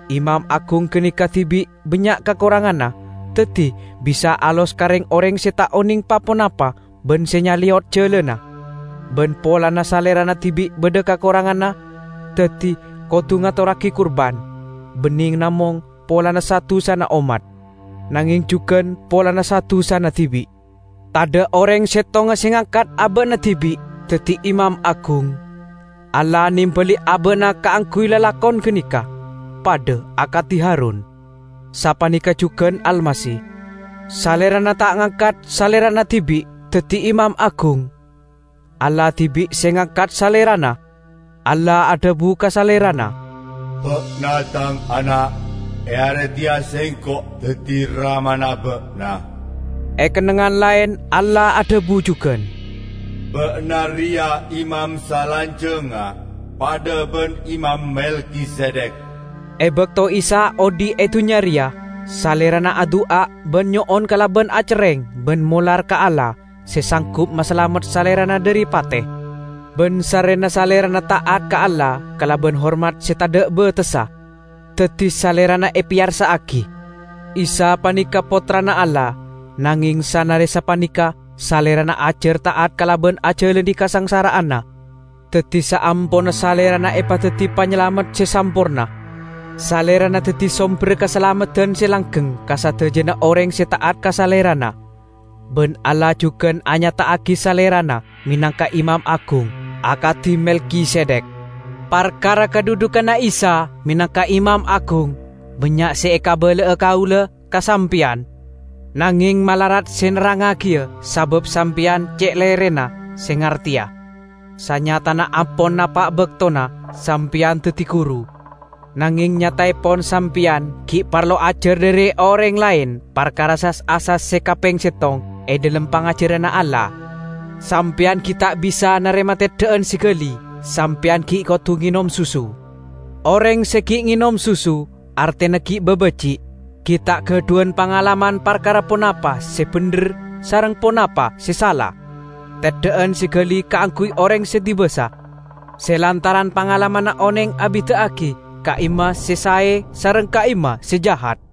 Imam agung ganeka dibi' bannya' kakoranganna, daddi bisa alos ka reng-oreng se ta' oneng pa-ponapa ban se nyaleyot jalanna. Ban polana salerana dibi' badha kakoranganna, daddi kodu ngatorragi kurban, banne namong polana sa-dusana ommat, nangeng jugan polana sa-dusana dibi'. Tadha' oreng settonga se ngangkat aba'na dibi' daddi imam agung. Allah nembali aba'na kaangguy lalakon ganeka -- padha akadi Harun. Sapaneka jugan Almasih. Salerana ta' ngangkat Salerana dibi' daddi Imam Agung. Allah dibi' se ngangkat Salerana. Allah adhabu ka Salerana, "Ba'na Tang Ana'; e are teya Sengko' daddi Ramana Ba'na." E kennengngan laen Allah adhabu jugan, "Ba'na reya imam salanjangnga, padha ban Imam Melkisedek." E bakto Isa odhi' e dunnya reya, Salerana adu'a ban nyo'on kalaban acerreng ban molar ka Allah, se sanggup masalamet Salerana dhari pate. Ban sarrena Salerana ta'at ka Allah kalaban hormat se tadha' batessa, daddi Salerana epeyarsa'agi. Isa paneka Pottrana Allah, nangeng sanare sapaneka Salerana ajar ta'at kalaban ajalane kasangsara'anna. Daddi saamponna Salerana epadaddi Panyalamet se samporna, Salerana daddi somberra kasalameddan se langgeng ka sadajana oreng se ta'at ka Salerana, ban Allah jugan anyata'agi Salerana menangka Imam Agung, akadi Melkisedek! Parkara kadhudhuganna Isa menangka Imam Agung, bannya' se ekabala'a kaula ka sampeyan, nangeng malarat se nerrangngagiya sabab sampeyan ce' lerena se ngarteya. Sanyatana ampon napa' baktona sampeyan daddi guru, nangeng nyataepon sampeyan gi' parlo ajar dhari oreng laen parkara sas-asas se kapeng settong e dhalem pangajaranna Allah. Sampeyan gi' ta' bisa narema teddha'an se gali, sampeyan gi' kodu ngenom susu. Oreng se gi' ngenom susu, artena gi' babaji', gi' ta' gadhuwan pangalaman parkara ponapa se bendher sareng ponapa se sala. Teddha'an se gali kaangguy oreng se dibasa, se lantaran pangalamanna oneng abida'agi ka'imma se sae sareng ka'imma se jahat.